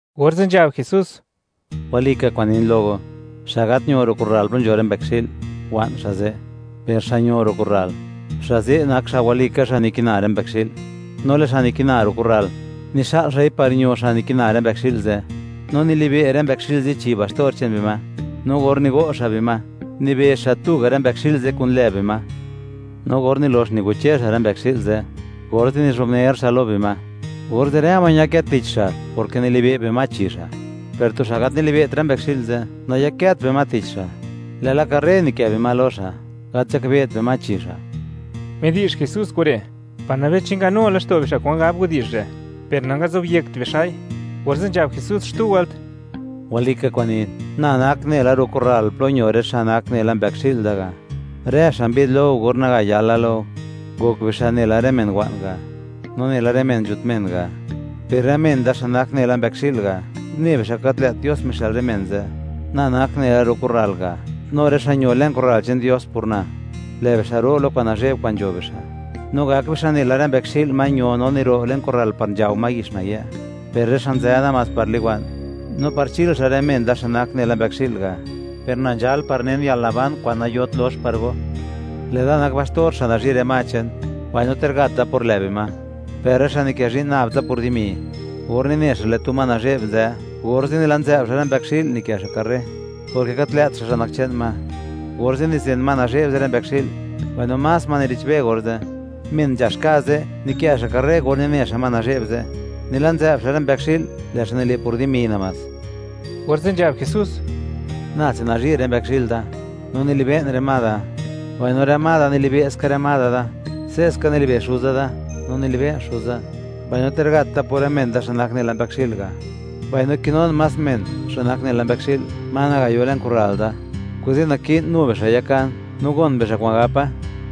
Orze' nzhab Jesús: ―Walika kwa'n nin lo go; xa' gat ño ro' kurral plo nzho rë mbëkxi'l, wa'n xa' ze'. Per xa' ño ro' kurral, xa' ze' nak xa' walika xa' nikina rë mbëkxi'l. No lë' xa' nikina ro' kurral, nixa'l xa'i par ño xa' nikina rë mbëkxi'l ze', no nilibe' rë mbëkxi'l ze' chi baxtor che'n bima. No or nigo' xa' bima, nibezh xa' tuga' rë mbëkxi'l ze' kun lë bima. No or nilox nigoche xa' rë mbëkxi'l ze', orze' nizhubner xa' lo bima, orze' rë ma ñakë tich xa', porke nilibe' bima chi xa'. Per tu xa' gat nilibe't rë mbëkxi'l ze', nayakët bima tich xa', lë'la karre nikë' bima lo xa', gat nzhakbe't bima chi xa'. Midi'zh Jesús kure' par nabei chi nganu laxto' bixa' kwan gab widi'zh re', per nangazobyekt bixa'i. Orze' nzhab Jesús xtu wëlt: ―Walika kwa'n nin, na nak nela ro' kurral plo ño rë xa' nak nela mbëkxi'l da ga'. Rë xa' mbi'd lo go or naga yala lo go, ngok bixa' nela rë men wa'n ga', no nela rë men nzhut men ga'; per rë men da xa' nak nela mbëkxi'l ga', une bixa' gat lë't Dios mixë'l rë men ze'. Na nak nela ro' kurral ga', no rë xa' ño le'n kurral che'n Dios por na, lë' bixa' ro' lo kwa'n nazhe'b kwa'n nzho bixa', no gak bixa' nela rë mbëkxi'l ma ño no niro' le'n kurral par nzhao ma yix nayë'. Per rë xa' nzë namás par liwa'n, no par chil xa' rë men da xa' nak nela mbëkxi'l ga'; per na nzhal par nen yalnaban kwa'n nayot lox par go. Lë'da nak baxtor xa' nazhi' rë ma che'n, mbaino ter gat da por lë' bima, per rë xa' nikë zhi'n nab tsa por dimi, or nine xa' lë' tu ma nazhe'b nzë, orze' nila' nzë'b xa' rë mbëkxi'l, nikë' xa' karre, porke gat lë't xa' xa' nak che'n ma; orze' nizen ma nazhe'b ze' rë mbëkxi'l, mbaino más ma nire'chbe orze'. Men nzhax ka' ze', nikë' xa' karre or nine xa' ma nazhe'b ze', nila' nzë'b xa' rë mbëkxi'l, lë' xa' nile' por dimi namás. Orze' nzhab Jesús: ―Nase nazhi' rë mbëkxi'l da, no nilibe'n rë ma da; mbaino rë ma da, nilibe' ska rë ma da. Se'ska nilibe' Xuza da, no nilibe'n Xuza; mbaino ter gat da por rë men da, xa' nak nela mbëkxi'l ga'. Mbaino kinun más men, xa' nak nela mbëkxi'l, ma naga yo le'n kurral da; kuze' naki'n nu bixa' yakan; no gon bixa' kwa'n gapa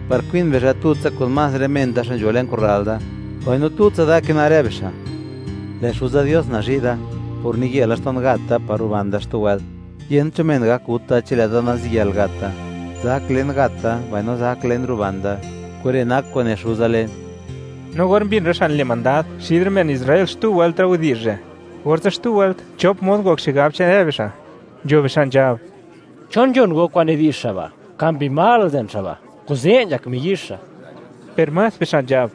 par kwin bixa' tutsa kun más rë men da xa' nzho le'n kurral da, mbaino tutsa da kina rë bixa'. ’Lë' Xuza Dios nazhi' da, por niye laxto'n gat da, par ruban da xtu wëlt. Yent cho men gak gut da chi lë'da naziyël gat da. Zak len gat da, mbaino zak len ruban da. Kure' nak kwa'n ne Xuza len. No or mbin rë xa' nile' mandad xid rë men Israel xtu wëlt rë widi'zh re', orze' xtu wëlt chop mod ngok xigab che'n rë bixa', nzho bixa' nzhab: ―¿Chon nzhon go kwa'n nidi'zh xa' ba'? ¡Ka mbi mal nzen xa' ba', kuze' nzhak miyizh xa'! Per más bixa' nzhab: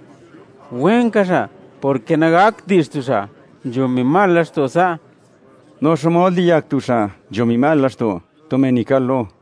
―¡Wenka xa', porke nagakt di'zh tu xa' nzho mbi mal laxto' sa'! ¿No xmod liyak tu xa' nzho mbi mal laxto' tu men nikal-lo?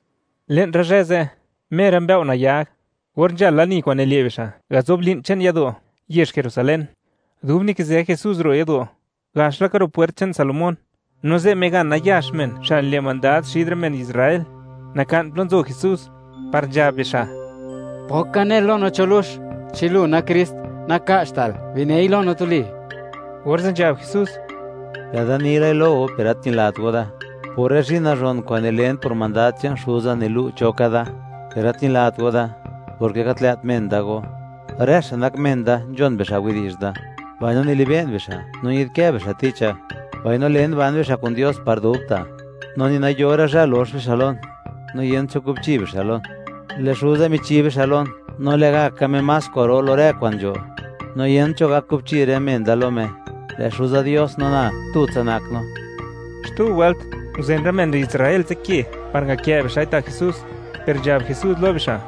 Le'n rë zhë ze', mer rë mbëo' nayag, or nzhal lani kwa'n nile' bixa' gazob li'n che'n yado' yezh Jerusalén, dub nikizë Jesús ro' yado' gax laka Ro' Pwert che'n Salomón, no ze' migan nayax men xa' nile' mandad xid rë men Israel, naka'n plo nzo Jesús, par nzhab bixa': ―¿Pok ka nel lo no cho lux? Chi lu nak Krist, naka'chtal; binei lo no tuli. Orze' nzhab Jesús: ―Lë'da ni lai lo go, per gat ñilat go da; por rë zhi'n nazhon kwa'n nilen por mandad che'n Xuza nilu', cho ka da, per gat ñilat go da, porke gat lë't men da go. Rë xa' nak men da, nzhon bixa' widi'zh da mbaino nilibe'n bixa', no ñi'dkë bixa' ticha; mbaino len, ban bixa' kun Dios par dubta', no ni nayora' zhë lox bixa' lon, no yent cho kubchi bixa' lon. Lë' Xuza michi bixa' lon, no lë'gaka Me más kwa'ro lo rë kwa'n nzho, no yent cho gak kubchi rë men da lo Me. Lë' Xuza Dios no na, tutsa nak no. Xtu wëlt, nguzen rë men Israel ze' ke par ngakë' bixa'i ta' Jesús, per nzhab Jesús lo bixa':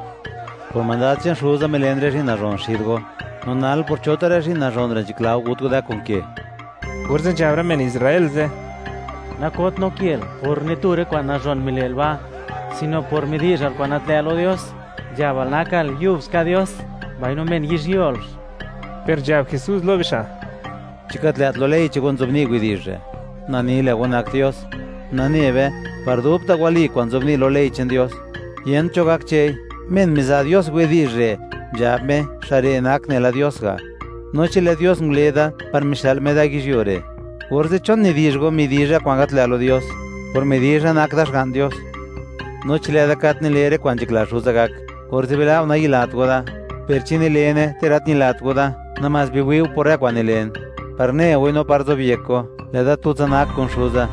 ―Por mandad che'n Xuza milen rë zhi'n nazhon xid go; no nal, ¿por cho tu rë zhi'n nazhon re' nzhakla go gut go da kun ke? Orze' nzhab rë men Israel ze': ―Nakot no kel por ni tu rë kwa'n nazhon mile'l ba', sino por midi'zhal kwa'n gat lë' lo Dios; nzhabal, nakal yubska Dios, mbaino ¡men yizhyuolx! Per nzhab Jesús lo bixa': ―¿Chi gat lë't lo ley che'n go nzobni' widi'zh re': “Na ni, lë' go nak dios”? Nane be, par dubta' wali kwa'n nzobni' lo Ley che'n Dios, yent cho gak chë'i. Men miza' Dios widi'zh re', nzhab Me, xa' re' nak nela Dios ga'. No chi lë' Dios ngule da par mixë'l Me da yizhyuo re', orze', ¿chon nidi'zh go, midizha kwa'n gat lë' lo Dios, por midizha, nak da Xga'n Dios? No chi lë'da gat nile rë kwa'n nzhakla Xuza gak, orze' bila' go nayilat go da; per chi nilene, ter nayilat go da, namás biwi' go por rë kwa'n nilen, par ne goi no par zobyek go, lë'da tutsa nak kun Xuza,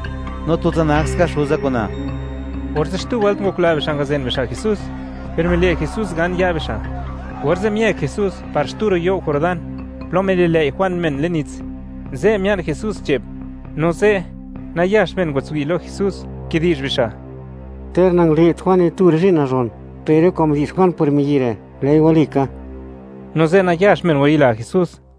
no tutsa nak ska Xuza kun na. Orze' xtu wëlt ngokla bixa' ngazen bixa' Jesús, per mile' Jesús gan ya' bixa'. Orze' miëk Jesús par xtu ro' you' Jordán, plo mililëi' Juan men le'n nits, ze' mia'n Jesús che'p, no ze', nayax men ngwatswi' lo Jesús, kidi'zh bixa': ―Ter nangale't Juan ni tu rë zhi'n nazhon, per rë kwa'n midi'zh Juan por miyi' re', lë'i walika. No ze' nayax men ngwayila Jesús.